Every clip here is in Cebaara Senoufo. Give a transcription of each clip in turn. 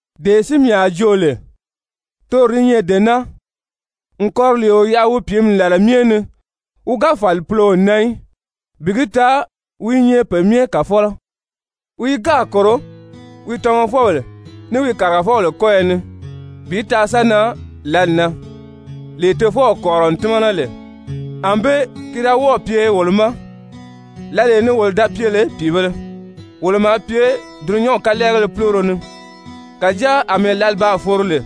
Dee si mii a joo lè toro di nyɛ dee naa, n kɔriliio yaʔa wi pìími làla myɛ ni wi ga fàli puloo na í, bi gi taa wi i nyɛ pe myɛ kàfɔlɔ. Wi i gáà kòro wi tamafɔbèle, ní wi kàrigafɔbèle kɔ́yɔ ni bi taa sa nan lǎli na, lee tofɔw kɔ̀rirɔ n tímana lè. Anbée ki da wɔ́ɔ̀ pye wolo ma lǎlee ni wolo da pye lè pìibēle, wolo maa pye dulunyanw kalɛɛgéle púloro ni. Kàjáa àmɛɛ lǎli baa foro lè,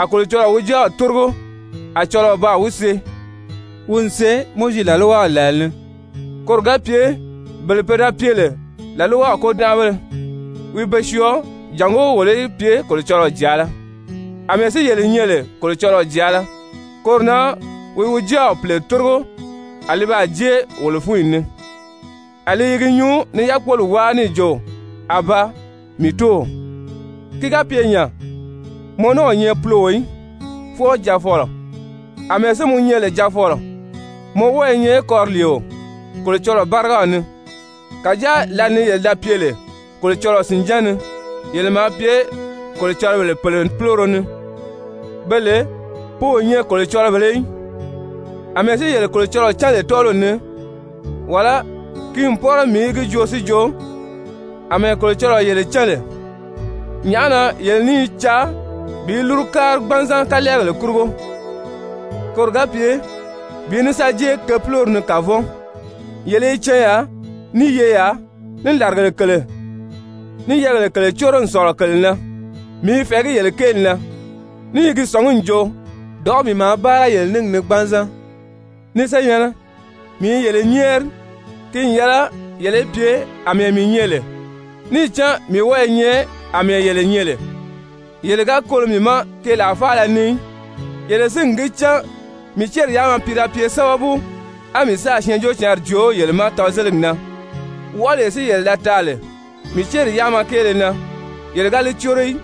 a Kolocɔlɔɔ wi Jáaw tórigo, a cɔlɔɔ baa wi see, wi n see Mowizi làlwaw làla ni, koro ga pye bele pe da pye lè làlwaw kôdanʔabéle, wi be syɔɔ jàngó wolo í pye Kolocɔlɔɔ jàala. Amɛɛ si yele nyɛ lè Kolocɔlɔɔ jàala, koro na wi wi Jáaw Pìle tórigo a li baa jée wolo fúnyi ni. A li i gi nyuu ni yákpoli wáa níì jo: «Abaa! Mii Tóow!» Ki ga pye nya, mɔ ní o nyɛ puloo í, fwɔɔ jaafɔlɔ. Amɛɛ si mɔ nyɛ lè jaafɔlɔ, mɔ wɔ́ɔ i nyɛ kɔriliio Kolocɔlɔɔ bárigaw ni. Kàjáa lǎli ni yele da pye lè Kolocɔlɔɔ sìnján ni, yele maa pye kolocɔlɔbèle pèle púloro ni, be lè pe o nyɛ kolocɔlɔbèlē í. Amɛɛ si yele Kolocɔlɔɔ cán lè tɔ́ɔliw ni, wàlá ki n pɔ́rɔ mii í gi joo si jo àmɛɛ Kolocɔlɔɔ yele cán lè, nyàʔá na yele ní i caa bi lúru kári gbanzan kalɛɛgèle kurugo, koro ga pye bi ní sa jée ke púlori ni kavɔn? Yele i canyaa, ní yeyaa, ní làrigèle kèle, ní yɛ́ɛgèle kèle córo n sɔ̀lɔ kèle na! Mii i fɛ̀ɛgí yele kéeli na, ní i gi sɔ̀ngí n jo, dɔ̀ʔɔ́ mii maa báara yele níngi ni gbanzan. Ni senyɛ̀nnɛ, mii i yele nyɛ́ɛri, ki n yɛlɛ yele í pye àmɛɛ mii nyɛ lè, níì cán mii wɔ́ɔ i nyɛ àmɛɛ yele nyɛ lè. Yele ga kolo mii ma keelaa faala ni í. Yele si n gi cán mii céri yáama pi da pye sábabu, á mii sáà Syɛɛnjóocǎnri joo yele ma tɔzeligi na. Wɔʔɔlee si yele da taa lè mii céri yáama kéele na, yele ga li córo í.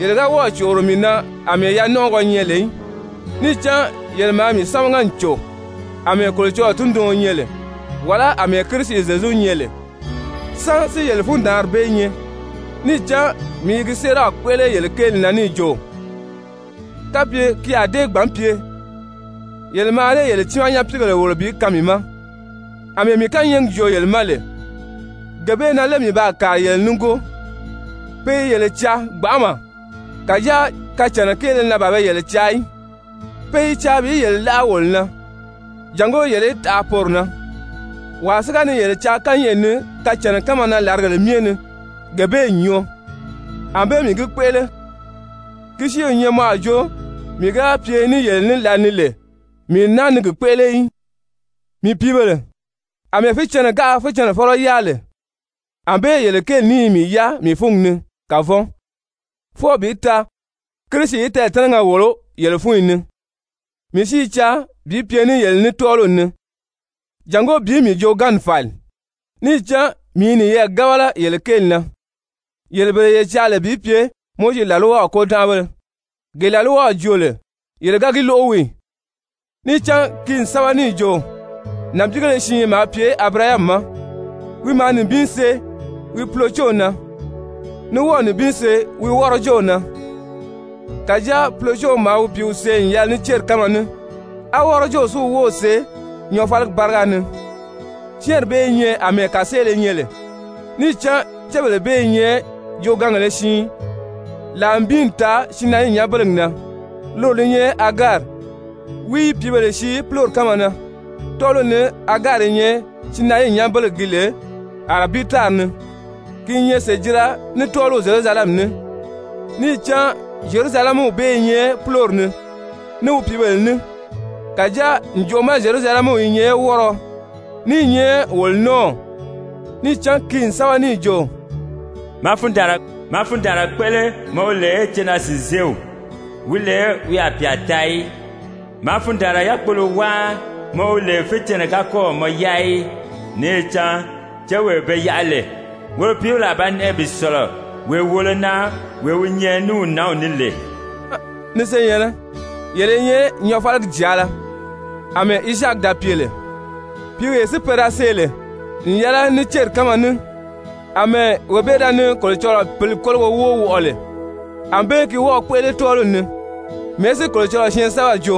Yele ga wɔ́ɔ̀ còʔoro mii na àmɛɛ yanɔnʔɔgɔ nyɛ lè í. Níì cán yele maa mii sámaga n cò àmɛɛ Kolocɔlɔɔ tunduɔn nyɛ lè, wàlá àmɛɛ Kirisi Zyezu nyɛ lè. Sán si yele fundaanri bee nyɛ? Níì cán mii i gi séeraw kpéʔele yele kéeli na níì jo, kapye ki a dée gbǎn pye, yele mǎà dée yele tiimaa nyapiigèle wòlo bi kaan mii ma. Amɛɛ mii kányɛɛgi joo yele ma lè, gee bee na lé mii baa kàri yele nígoo? Pe i yele caa gbanʔama, kàjáa kacànna kéele na ban be yele caa í, pe i caa bi yele láʔa wolo na, jàngó yele í taʔa poro na. Wàa si ga ni yele caa kányɛʔɛ ni kacànna kánma na làrigèle myɛ ni, gee bee n nyɔɔ, ànbée mii gi kpéʔele, ki si o nyɛ mɔ a jo mii ga pye ní yele ní lǎli ni lè mii n náa ni gi kpéʔele í. Mii pìíbèle, àmɛɛ fícɛnnɛ gáā fícɛnnɛfɔlɔ yáa lè, ànbée yele kéeli ní i mii yáa mii fúngi ni kavɔn, fwɔɔ bi taa Kirisi í tɛɛ̀tɛ́nɛgɛ wòlo yele fúnyi ni. Mii si i caa bi pye ní yele ní tɔ́ɔliw ni jàngó bi mii jooganmi fàli, níì cán mii i niyɛɛ gábala yele kéeli na. Yele bele ye caa lè bi pye Mowizi làlwaw kôdanʔabéle, gee làlwaw joo lè yele ga gi lóʔo wii ì? Níì cán ki n sɛ́bɛ níì jo nànbiigéle siin maa pye Abirahami ma, wi maa nibin see wi pulocew na ní wɔ́ɔ̀ nibin see wi wɔ́rɔjew na. Kàjáa pulocew maa wi pìíw see n yɛlɛ ní céri kánma ní, á wɔ́rɔjew si wi wów see nyɔɔfaligi báriga ni. Syɛ́ɛnri bee i nyɛ àmɛɛ kàseele nyɛ lè. Níì cán cébèle bee i nyɛ joogaangèle siin. Làa nibin n taa Sinayii nyanbelegi na, loro li nyɛ Agari, wi i pìíbèle sii púlori kánma na. Tɔ́ɔliw ni Agari i nyɛ Sinayii nyanbelegi gi lè Arabii tári ni, ki i nyɛ sèjira ní tɔ́ɔliw Zyerusalɛmi ní, níì cán Zyerusalɛmiw bee i nyɛ púlori ni, ní wi pìíbèle ní. Kàjáa ǹjoʔo ma Zyerusalɛmiw i nyɛ wɔ́rɔɔ, ní i nyɛ wolo nɔ́ɔw. Níì cán ki n sɛ́bɛ n jo: «Maa fundaanra kpéʔele mɔ wi lè cenaa-sìnzeew, wi lè wi a pyà taa í! Maa fundaanra yákpogbɔɔlɔ wáa mɔ wi lè fícɛnnɛ ga kɔ́ɔ̀ mɔ yáa í! Níì cán céwee be yaʔa lè, woro pìíbèle a ba nɛʔɛ bi sɔ̀lɔ wee wòolo na wee wi nyɛ ní wi nǎnw ní lè.» Yele si na, ni senyɛ̀nnɛ, yele i nyɛ nyɔɔfaligi jàala àmɛɛ Izaaki da pye lè. Pìíwee si pe da see lè n yɛlɛ ní céri kánma ní, àmɛɛ wee bee da ni Kolocɔlɔɔ Pǐli kólogo wóo wɔʔɔ lè, ànbée gi wɔ́ɔ̄ kpéʔele tɔ́ɔliw ni. Mɛ̀ɛ́ si Kolocɔlɔɔ syɛɛnsɛbɛri jo?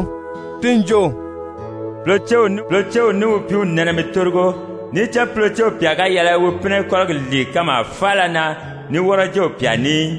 Ti n jo: «Pulocew ní wi pìíw nɛnɛ mi tórigo, níì cán pulocew pyà ga yɛlɛ wi pínɛ kɔ́rigi lìi kanmaa faala na ní wɔ́rɔjew pyà ní í.»